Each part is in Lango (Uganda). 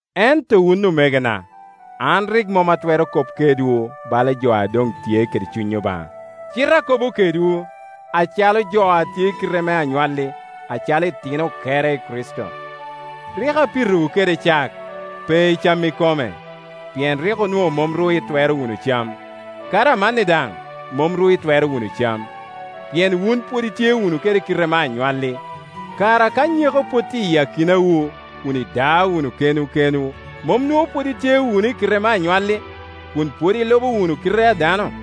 Ento wun omegona, an rik mom atwero kop kedwu bala jo a doŋ tye kede Cuny Obaŋa, cite akobo kedwu acalo jo a tye i kite me anywalli, acalo itino okere i Kricito. Rik apitowu kede cak, pe i cam ikome, pien rik onwoŋo mom ru itwero wunu cam; kadi amanni daŋ mom ru itwero wunu cam, pien wunu pwod itye wunu i kite me anywalli. Kara ka nyeko pwod tye i akinawu, kun ida wunu kenwu kenwu, mom nwoŋo pwod itye wunu i kite me anywalli, kun pwod ilubo wunu kite a dano?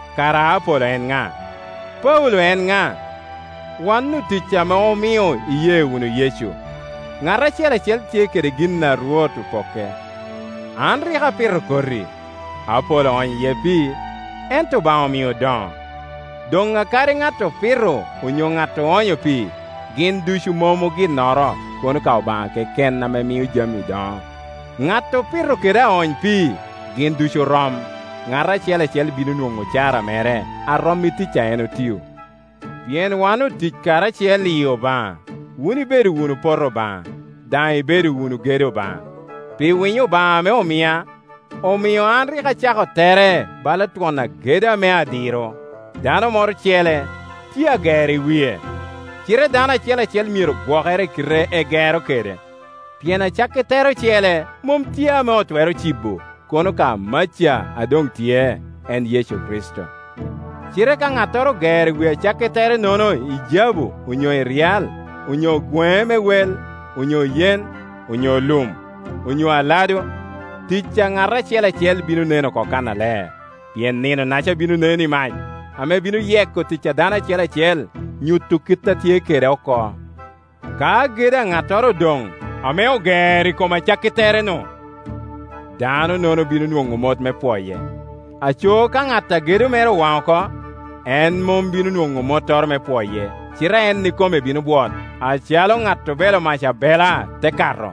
Kara Apolo en ŋa? Paulo en ŋa? Wan otic ame omio iye wunu Yecu. Ŋat acel acel tye kede gin a Rwot opokke. An rik apito koti, Apolo oonyo iye pii, ento Obaŋa omio odoŋo. Doŋ akadi ŋat opito onyo ŋat oonyo pii, gin ducu mom oginnoro kono ka Obaŋa keken ame miyo jami doŋo, ŋat opito kede aony pii, gin ducu orom, ŋat acel acel bino nwoŋo ocara mere a rom i tic a en otio. Pien wan otic karacel i Obaŋa; wun ibedo wunu poto Obaŋa, daŋ ibedo wunu gedo Obaŋa. Pi winyo Obaŋa ame omia, omio an rik acako tere bala twon agedo ame adiro; dano moro ocele tye agero i wie. Cite dano acel acel myero gwokere i kite egero kede. Pien acakki tere ocele mom tye ame otwero cibo, kono ka maca a doŋ tye, en Yecu Kricito. Cite ka ŋattoro ogero i wi acakki tere-nono i jabu onyo i ryal, onyo gweŋe me wel, onyo yen, onyo lum, onyo aladu, tic a ŋat acel acel bino nen oko kannaler. Pien Nino-naca bino nen i mac, ame bino yeko tic a dano acel acel, nyuto kit a tye kede oko. Ka gedo a ŋattoro odoŋ, ame ogero i kom acakki tere-nu, dano-nono bino nwoŋo mot me pwoye. Aco ka ŋat a gedo mere owaŋ oko, en mom bino nwoŋo mottoro me pwoye, cite en ikome bino bwot, acalo ŋat obelo mac abela te kato.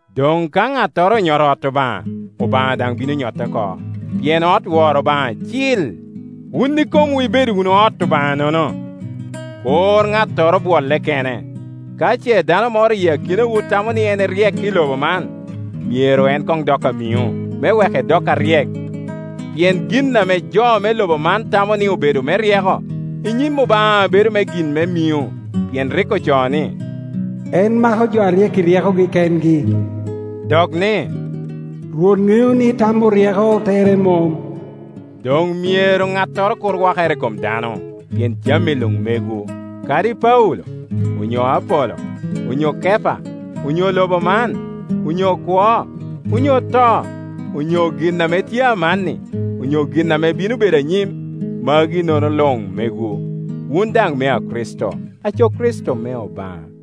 Doŋ ka ŋattoro onyoto ot Obaŋa, Obaŋa daŋ bino nyote oko; pien ot woro Obaŋa cil, wun ikomwu ibedo wunu ot Obaŋanono. Kur ŋattoro bwolle kene. Ka ce dano moro i akinawu tamo ni en eryek i lobo man, myero en koŋ dok amiŋo, me wek edok aryek. Pien gin ame jo me lobo man tamo ni obedo me ryeko i nyim Obaŋa bedo gin me miŋo. Pien rik ocoo ni, “En mako jo aryek i ryekogi kengi,” dok ni, “Rwot ŋeo ni tam oryeko tere mom.” Doŋ myero ŋattoro kur wakere i kom dano, pien jami luŋ megwu; kadi Paulo, onyo Apolo, onyo Kepa, onyo lobo man, onyo kwo, onyo to, onyo gin ame tye amanni, onyo gin ame bino bedo anyim; magi-nono luŋ megwu; wun daŋ mea Kricito, aco Kricito me Obaŋa.